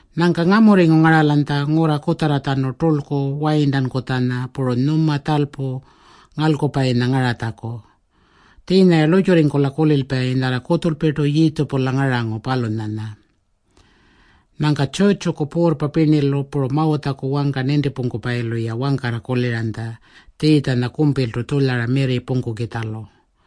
Nyangka ngamurringu ngaralanytja ngurra kutjarratjanu turlku Wayirntankutjanya puru Nyuma Tjalpu Ngalkupayinya ngaratjaku. Tjiinya-ya lurrtjurringkula kulilpayi nyarra kutjulpirtu Yiitjipula ngarangu, palunyanya. Nyangka tjurrtjuku puurrpa pirnilu puru Mawutjaku wangka nintipungkupayilu-ya wangkarra kuliranytja Tjiitjanya kumpiltu tjulyara mirri pungkukitjalu.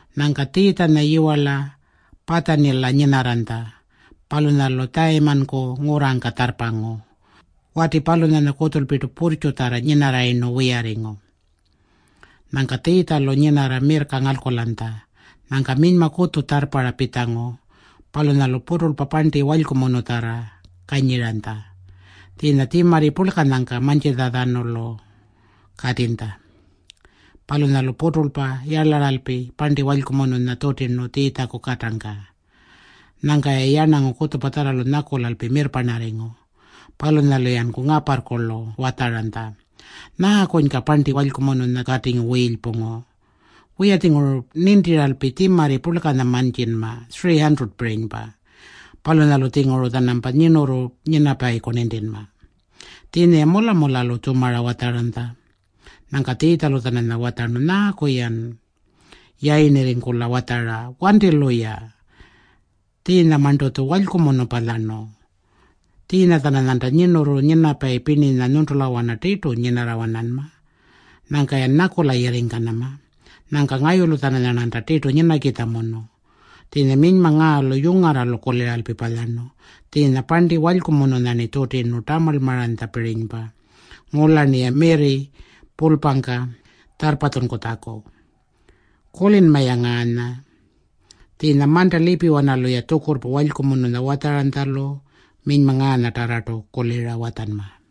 Nyangka Tjiitjanya yiwarla Patjanila nyinarranytja. Palunyalu Tjayimanku ngurrangka tjarrpangu. Wati palunyanya kutjulpirtu purrtjutjarra nyinarrayirnu wiyarringu. Nyangka Tjiitjalu nyinarra mirrka ngalkulanytja. Nyangka minyma kutju tjarrparra pitjangu. Palunyalu puturlpa parnti walykumunutjarra kanyiranytja. Tjiinya tjimarri purlkanyangka mantjintjatjanulu katinytja. Palunyalu puturlpa yarlaralpi parnti walykumununya tjutirnu Tjiitjaku katangka. Nyangka-ya yarnangu kutjupatjarralu nyakulalpi mirrparnarringu. Palunyalu-yanku ngaparrkulu watjaranytja, “Nyaakunyka parnti walykumununya katingu wiilypungu? Wiya-tjinguru nintiralpi tjimarri purlkanya mantjinma, 300-pirinypa. Palunyalu-tjinguru-tjanampa nyirnurru nyinapayiku nintinma.” Tjiinya-ya mula-mulalu tjumara watjaranytja. Nyangka Tjiitjalu-tjananya watjarnu, “Nyaaku-yan yayirnirringkula watjara? Wanti-luya. Tjiinyamarntu-tju walykumunu palyarnu. Tjiinya-tjananyanta nyirnurru nyinapayi pirninya nyuntulawana tirtu nyinarra-wananma. Nyangka-yan nyakula yirringkanama. Nyangka ngayulu-tjananyarnanta tirtu nyinakitjamunu. Tjiinya minyma ngaalu yungarralu kuliralpi palyarnu. Tjiinya parnti walykumununya-rni tjutirnu tamarlmanupirinypa ngula-rniya mirri pulpangka tjarrpatjunkutjaku. Kulinma-ya ngaanya. Tjiinya manta lipiwanalu-ya tjukurrpa walykumununya watjaranytjalu minyma ngaanyatarrartu kulira watjanma.”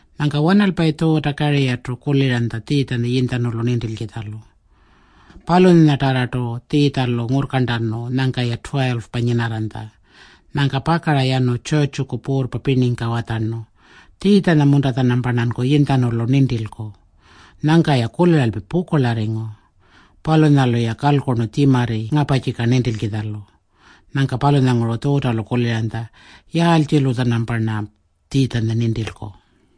Nyangka wanalpayi Tjuuta-Kariyarrtu kuliranytja Tjiitjanya yinytjanulu nintilkitjalu. Palunyanyatarrartu Tjiitjalu ngurrkarntanu nyangka-ya 12-pa nyinarranytja. Nyangka pakara yanu tjurrtjuku puurrpa pirningka watjarnu, “Tjiitjanya-munta-tjanamparnanku yinytjanulu nintilku?” Nyangka-ya kuliralpi pukurlarringu. Palunyalu-ya kalkurnu tjimarri ngaparrtjika nintilkitjalu. Nyangka palunyanguru Tjuutalu kuliranytja, “Yaaltjilu-tjanamparna Tjiitjanya nintilku?”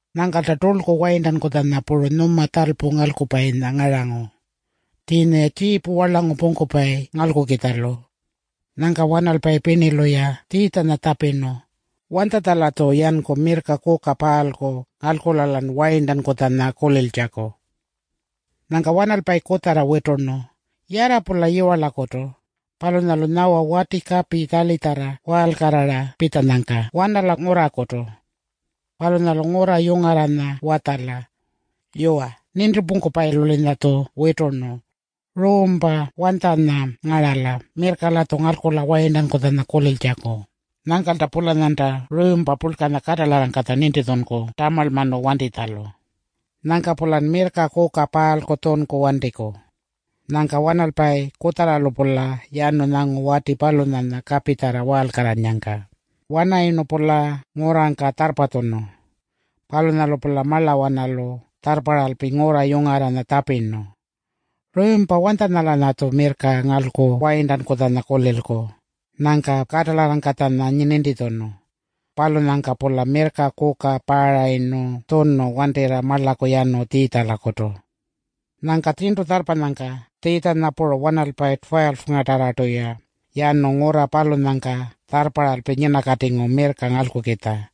Nyangkalta turlku Wayirntankutjanya puru Nyuma Tjalpu Ngalkupayinya ngarangu. Tjiinya-ya tjiipu warlangu pungkupayi ngalkukitjalu. Nyangka wanalpayi pirnilu-ya Tjiitjanya tjapirnu, “Wanytjatja-latju yanku mirrka kuka paalku ngalkula-lan Wayirntankutjanya kuliltjaku?” Nyangka wanalpayi kutjarra witurnu, “Yarra-pula yiwarlakutu. Palunyalu nyawa wati kapi tjarlitjarra waalkarrara pitjanyangka wanala ngurrakutu. Palunyalu ngurra yungarranya watjala, ‘Yuwa, Nintipungkupayilu-linyatju witurnu. Ruumpa wanytjanya ngarala mirrka-latju ngalkula Wayirntankutjanya kuliltjaku?’ Nyangkalta-pulanyanta ruumpa purlkanya katalarrangkatja nintitjunku tamarlmanu wantitjalu. Nyangka-pulan mirrka kuka paalku tjunku wantiku.” Nyangka wanalpayi kutjarralu-pula yanu nyangu wati palunyanya kapitjarra waalkarrannyangka. Wanarayirnu-pula ngurrangka tjarrpatjunu. Palunyalu-pula marlawanalu tjarrparralpi ngurra yungarranya tjapirnu, “Ruumpa wanytjangka-latju mirrka ngalku Wayirntankutjanya kulilku?” Nyangka katalarrangkatjanya nintitjunu. Palunyangka-pula mirrka kuka paarayirnu tjunu wantirra marlaku yanu Tjiitjalakutu. Nyangka tjirntu tjarrpanyangka Tjiitjanya puru wanalpayi 12-nyatarrartu-ya yanu ngurra palunyangka tjarrparralpi nyinakatingu mirrka ngalkukitja.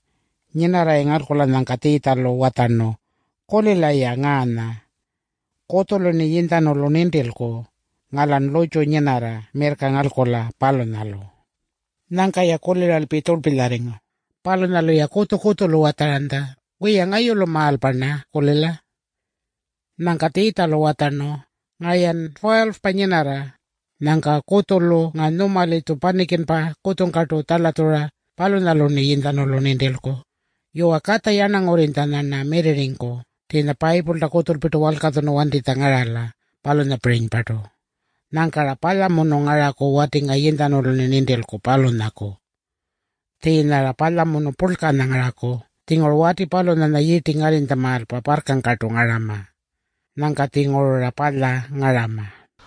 Nyinarra-ya ngalkulanyangka Tjiitjalu watjarnu, “Kulila-ya ngaanya. Kutjulu-rni yinytjanulu nintilku, ngaa-lan lurrtju nyinarra mirrka ngalkula, palunyalu.” Nyangka-ya kuliralpi tjurlpilyarringu. Palunyalu-ya kutju-kutjulu watjaranytja, “Wiya, ngayulumaalpa-rna-kulila.” Nyangka Tjiitjalu watjarnu, “Ngaa-yan 12-pa nyinarra. Nyangka kutjulu ngaa nyuma-litju panikinpa kutjungkartu tjalatjura, palunyalu-rni yinytjanulu nintilku. Yuwa, Katja Yarnangurrinytjanya-rna mirrirringku tjiinya Payipulta kutjulpirtu walkatjunu wantitjanya ngarala, palunyapirinypartu. Nyangka-ra palyamunu ngaraku wati ngaa yinytjanulu-rni nintilku, palunyaku. Tjiinya-ra palyamunu purlkanya ngaraku. Tjinguru wati palunyanya yirti ngarrinytjamaalpa parrkangkartu ngarama. Nyangka-tjinguru-ra palya ngarama.”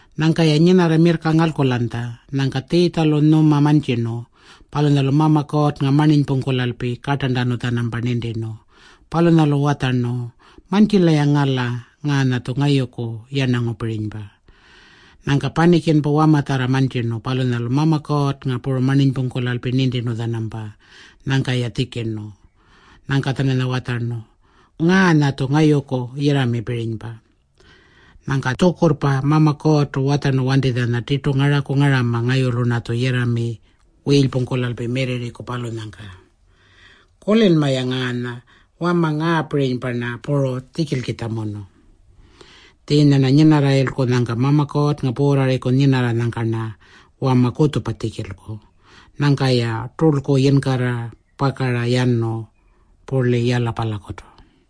Nyangka-ya nyinarra mirrka ngalkulanytja. Nyangka Tjiitjalu nyuma mantjirnu. Palunyalu Mama Kuurrnga marninypungkulalpi kartarntanu-tjanampa nintirnu. Palunyalu watjarnu, “Mantjila-ya ngala. Ngaanya-tju ngayuku yarnangupirinypa.” Nyangka panikinpa wamatjarra mantjirnu. Palunyalu Mama Kuurrnga puru marninypungkulalpi nintirnu-tjanampa. Nyangka-ya tjikirnu. Nyangka-tjananya watjarnu, “Ngaanya-tju ngayuku yirramipirinypa. Nyangka tjukurrpa Mama Kuurrtu watjarnu wantitjanya tirtu ngaraku ngarama ngayulu-rnatju yirrami wiilypungkulalpi mirrirriku, palunyangka. Kulinma-ya ngaanya. Wama ngaapirinypa-rna puru tjikilkitjamunu. Tjiinya-rna nyinarrayilku, nyangka Mama Kuurrnga puurrarriku nyinarranyangka-rna wama kutjupa tjikilku.” Nyangka-ya turlku yinkarra pakara yanu purli Yalapalakutu.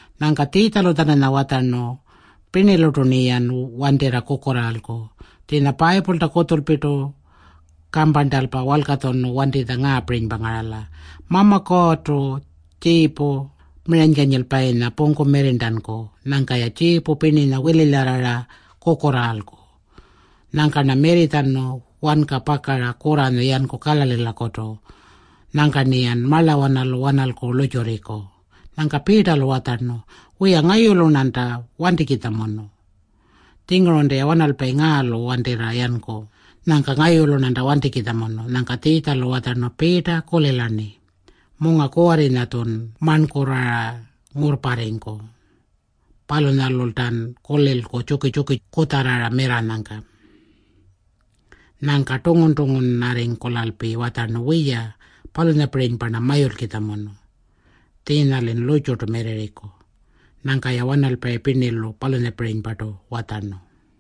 Nyangka Tjiitjalu-tjananya watjarnu, “Pirnilurtu-rniyan wantirra kukurraalku. Tjiinya Payipulta kutjulpirtu kamparntalpa walkatjunu wantingu ngaapirinypa ngarala, ‘Mama Kuurrtu tjiipu miranykanyilpayinya pungku mirrirntanku. Nyangka-ya tjiipu pirninya wililyarrara kukurraalku.’ Nyangka-rna mirritjanu wanka pakara kurranyu yanku Kalalilakutu. Nyangka-rniyan marlawanalu wanalku lurrtjurriku.” Nyangka Piitalu watjarnu, “Wiya, ngayulu-rnanta wantikitjamunu. Tjingurunta-ya wanalpayi ngaalu wantirra yanku. Nyangka ngayulu-rnanta wantikitjamunu.” Nyangka Tjiitjalu watjarnu, “Piita, kulila-rni. Munga kuwarrinya-tjun marnkurrara ngurrparringku. Palunyalultan kulilku tjuki-tjuki kutjarrara mirrarranyangka.” Nyangka tungun-tungunarringkulalpi watjarnu, “Wiya, palunyapirinypa-rna mayulkitjamunu. Tjiinya-lin lurrtjurtu mirrirringku.” Nyangka-ya wanalpayi pirnilu palunyapirinypartu watjarnu.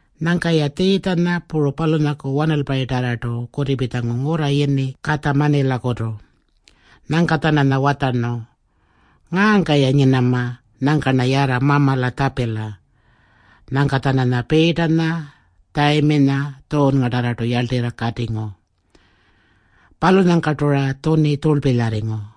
Nyangka-ya Tjiitjanya puru palunyaku wanalpayinyatarrartu kutipitjangu ngurra yini Katjamanilakutu. Nyangka-tjananya watjarnu, “Ngaangka-ya nyinama. Nyangka-rna yarra Mamala tjapila.” Nyangka-tjananya Piitanya, Tjayiminya, Tjuunngatarrartu yarltirra katingu. Palunyangkartu-ra tjuni tjurlpilyarringu.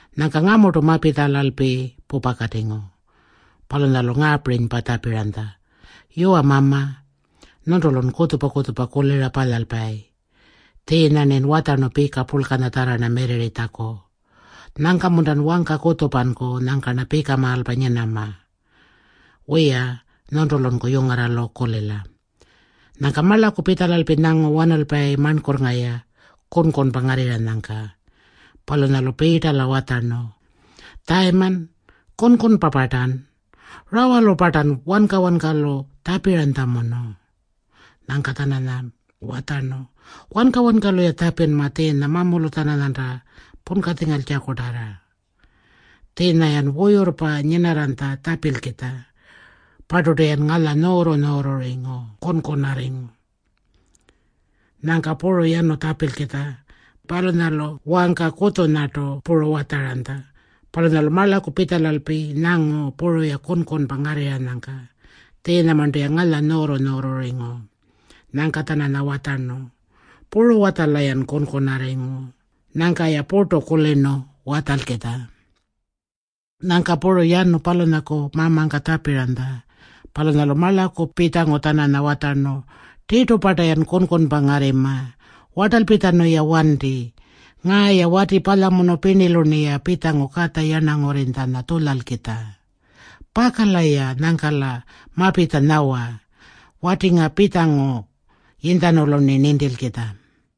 Nyangka ngamurtu mapitjalalpi pupakatingu. Palunyalu ngaapirinypa tjapiranytja, “Yuwa Mama, nyuntulun kutjupa-kutjupa kulira palyalpayi. Tjiinya-rnin watjarnu pika purlkanyatjarra-rna mirrirritjaku. Nyangka-muntan wangka kutjupanku nyangka-rna pikamaalpa nyinama? Wiya, nyuntulunku yungarralu kulila.” Nyangka marlaku pitjalalpi nyangu wanalpayi marnkurrnga-ya kunkunpa ngarrirranyangka. Palunyalu Piitala watjarnu, “Tjayiman, kunkunarringu-partan? Rawalu-partan wanka-wankalu tjapiranytjamunu?” Nyangka-tjananya watjarnu, “Wanka-wankalu-ya tjapinma tjiinya mamulu-tjananyanta punkatjingaltjakutarra. Tjiinya-yan wuyurrpa nyinarranytja tjapilkitja. Parturtu-yan ngalya nyuurru-nyuurrurringu kunkunarringu.” Nyangka puru yanu tjapilkitja. Palunyalu wangka kutjunyartu puru watjaranytja. Palunyalu marlaku pitjalalpi nyangu puru-ya kunkunpa ngarrirranyangka. Tjiinyamarntu-ya ngalya nyuurru-nyuurrurringu. Nyangka-tjananya watjarnu, “Puru-watjala-yan kunkunarringu?” Nyangka-ya purtu kulirnu watjalkitjalu. Nyangka puru yanu palunyaku Mamangka tjapiranytja. Palunyalu marlakulu pitjangu-tjananya watjarnu, “Tirtu-parta-yan kunkunpa ngarrima? Wartalpitjanu-ya wanti. Ngaa-ya wati palyamunu pirnilu-rniya pitjangu Katja Yarnangurrinytjanya tjulyalkitja. Pakala-ya nyangka-la mapitja nyawa. Wati ngaa pitjangu yinytjanulu-rni nintilkitja.”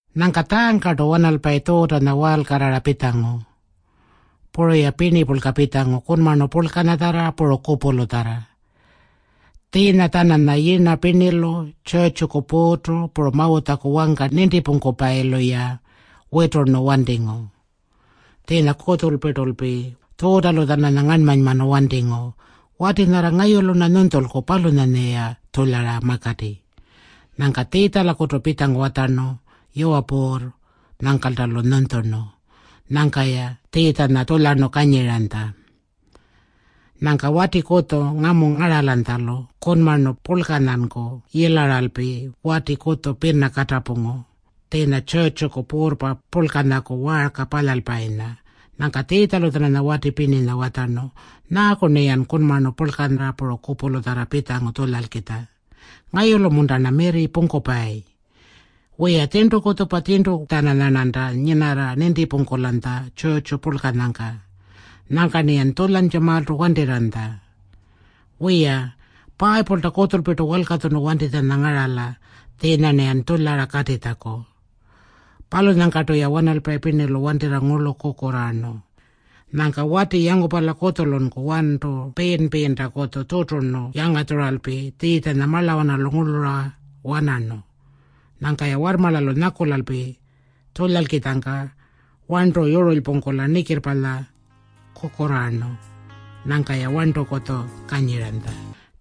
Nyangka tjaangkartu wanalpayi Tjuutanya waalkarrara pitjangu. Puru-ya pirnipurlka pitjangu kunmarnu purlkanyatjarra puru kupulutjarra. Tjiinya-tjananya yirna pirnilu, tjurrtjuku puurrtu, puru Mawutjaku wangka nintipungkupayilu-ya witurnu wantingu. Tjiinya kutjulpirtulpi Tjuutalu-tjananya ngarnmanymanu wantingu, “Wati nyarra ngayulu-rna nyunytjulku, palunyanya-ya tjulyara makati.” Nyangka Tjiitjalakutu pitjangu watjarnu, “Yuwa Puurr.” Nyangkalta-lu nyunytjurnu. Nyangka-ya Tjiitjanya tjulyarnu kanyiranytja. Nyangka wati kutju ngamu ngaralanytjalu kunmarnu purlkanyanku yilaralpi wati kutju pina katapungu, tjiinya tjurrtjuku puurrpa purlkanyaku waarka palyalpayinya. Nyangka Tjiitjalu-tjananya wati pirninya watjarnu, “Nyaaku-rniyan kunmarnu purlkanya puru kupulutjarra pitjangu tjulyalkitja? Ngayulu-munta-rna mirri pungkupayi? Wiya, tjirntu kutjupa tjirntu-tjananyarnanta nyinarra nintipungkulanytja tjurrtju purlkanyangka. Nyangka-rniyan tjulyantjamaaltu wantirranytja. Wiya, Payipulta kutjulpirtu walkatjunu wantitjanya ngarala tjiinya-rniyan tjulyara katitjaku.” Palunyangkartu-ya wanalpayi pirnilu wantirra ngurlu kukurraarnu. Nyangka wati yangupala kutjulunku warntu piin-piintakutju tjuturnu yangatjuralpi Tjiitjanya marlawanalu ngurlura wanarnu. Nyangka-ya warrmarlalu nyakulalpi tjulyalkitjangka warntu yurulypungkula nikirrpalya kukurraarnu. Nyangka-ya warntukutju kanyiranytja.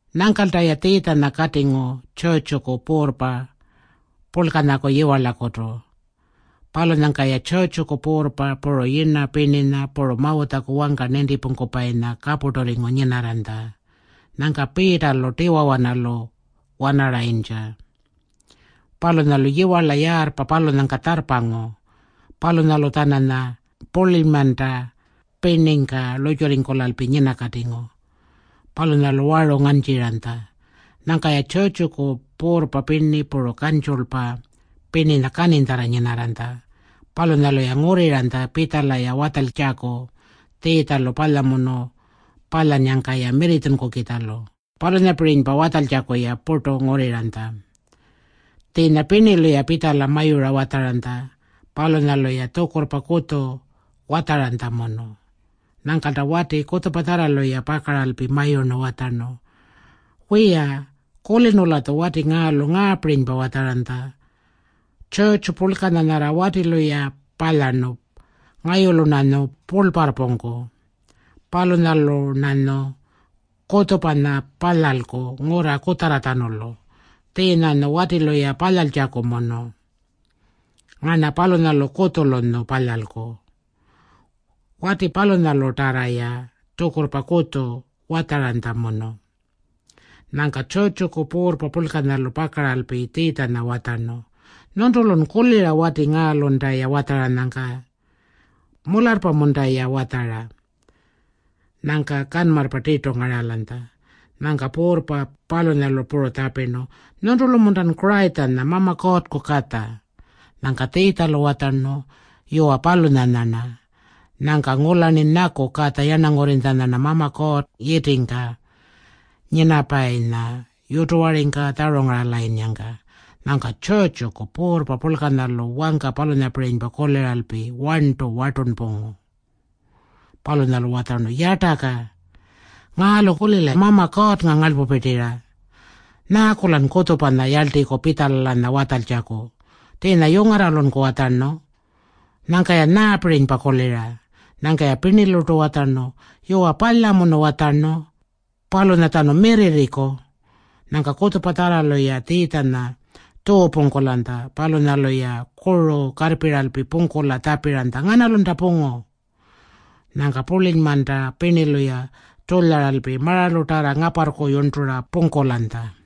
Nyangkalta-ya Tjiitjanya katingu tjurrtjuku puurrpa purlkanyaku yiwarlakutu. Palunyangka-ya tjurrtjuku puurrpa, puru yirna pirninya, puru Mawutjaku wangka nintipungkupayinya kapurturringu nyinarranytja. Nyangka Piitalu tiwawanalu wanarayintja. Palunyalu yiwarla yaarrpa palunyangka tjarrpangu. Palunyalu-tjananya purlinymanta pirningka lurrtjurringkulalpi nyinakatingu. Palunyalu waru ngantjiranytja. Nyangka-ya tjurrtjuku puurrpa pirni puru kantjulpa pirninya kaninytjarra nyinarranytja. Palunyalu-ya ngurriranytja pitjala-ya watjaltjaku Tjiitjalu palyamunu palyannyangka-ya mirritjunkukitjalu. Palunyapirinypa watjaltjaku-ya purtu ngurriranytja. Tjiinya pirnilu-ya pitjala mayura watjaranytja. Palunyalu-ya tjukurrpa kutju watjaranytjamunu. Nyangkalta wati kutjupatjarralu-ya pakaralpi mayurnu watjarnu, “Wiya, kulirnu-latju wati ngaalu ngaapirinypa watjaranytja. Tjurrtju purlkanya nyarra watilu-ya palyarnu, ngayulu-rnanyu purlparrpungku. Palunyalu-rnanyu kutjupanya palyalku ngurra kutjarratjanulu. Tjiinyanyu watilu-ya palyaltjakumunu. Ngarna palunyalu kutjulunyu palyalku.” Wati palunyalutarra-ya tjukurrpa kutju watjaranytjamunu. Nyangka tjurrtjuku puurrpa purlkanyalu pakaralpi Tjiitjanya watjarnu, “Nyuntulun kulira wati ngaalunta-ya watjaranyangka. Mularrpa-munta-ya watjara?” Nyangka kanmarrpa tirtu ngaralanytja. Nyangka puurrpa palunyalu puru tjapirnu, “Nyuntulu-muntan Kurayitjanya, Mama Kuurrku Katja?” Nyangka Tjiitjalu watjarnu, “Yuwa, palunyanya-rna. Nyangka ngula-rniyan nyaku Katja Yarnangurrinytjanya-rna Mama Kuurrta yitingka nyinapayinya yutuwaringka tjarungaralayinnyangka.” Nyangka tjurrtjuku puurrpa purlkanyalu wangka palunyapirinypa kuliralpi warntunku wartunpungu. Palunyalu watjarnu, “Yartaka! Ngaalu-kulila Mama Kuurrnga ngarlpupirtira. Nyaaku-lan kutjupanya yarltiku pitjala-lanya watjaltjaku? Tjiinya yungarralunku watjarnu. Nyangka-yan nyaapirinypa kulira?” Nyangka-ya pirnilurtu watjarnu, “Yuwa, palyamunu watjarnu. Palunyatjanu mirrirriku.” Nyangka kutjupatjarralu-ya Tjiitjanya tjuupungkulanytja. Palunyalu-ya kuru karrpiralpi pungkula tjapiranytja, “Nganalunta pungu?” Nyangka purlinymanta pirnilu-ya tjulyaralpi maralutarra ngaparrku yurntura pungkulanytja.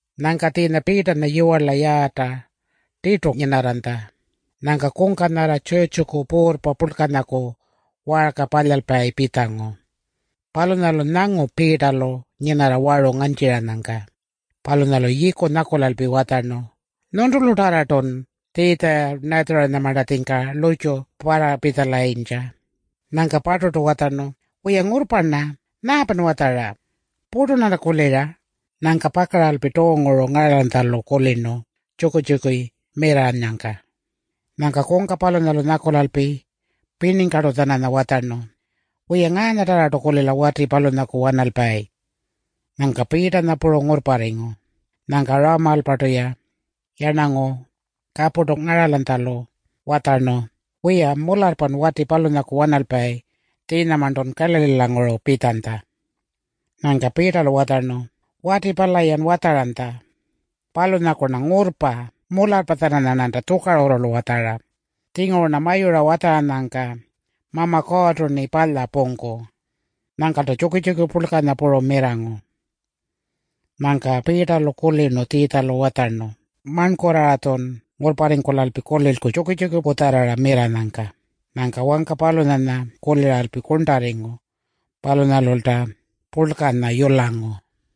Nyangka tjiinya Piitanya yiwarla yaarrta tirtu nyinarranytja. Nyangka kungka nyarra tjurrtjuku puurrpa purlkanyaku waarka palyalpayi pitjangu. Palunyalu nyangu Piitalu nyinarra waru ngantjiranyangka. Palunyalu yiiku nyakulalpi watjarnu, “Nyuntulutarrartun Tjiitja-Natjarinyamartatjingka lurrtju parrapitjalayintja.” Nyangka-parturtu watjarnu, “Wiya, ngurrpa-rna. Nyaapan watjara? Purtu-rnanta kulira.” Nyangka pakaralpi tuunguru ngaralanytjalu kulirnu tjuki-tjuki mirranyangka. Nyangka kungka palunyalu nyakulalpi pirningkartu-tjananya watjarnu, “Wiya, ngaanyatarrartu-kulila wati palunyaku wanalpayi.” Nyangka Piitanya puru ngurrparringu. Nyangka rawamaalpartu-ya yarnangu kapurtu ngaralanytjalu watjarnu, “Wiya, mularrpan wati palunyaku wanalpayi. Tjiinyamarntun Kalalilanguru pitjanytja.” Nyangka Piitalu watjarnu, “Wati pala-yan watjaranytja, palunyaku-rna ngurrpa. Mularrpa-tjananyarnanta tjukarurrulu watjara. Tjinguru-rna mayura watjaranyangka Mama Kuurrtu-rni palya pungku.” Nyangkalta tjuki-tjuki purlkanya puru mirrangu. Nyangka Piitalu kulirnu Tjiitjalu watjarnu, “Marnkurrara-tjun ngurrparringkulalpi kulilku tjuki-tjuki kutjarrara mirranyangka.” Nyangka wangka palunyanya kuliralpi kurntarringu. Palunyalulta purlkanya yulangu.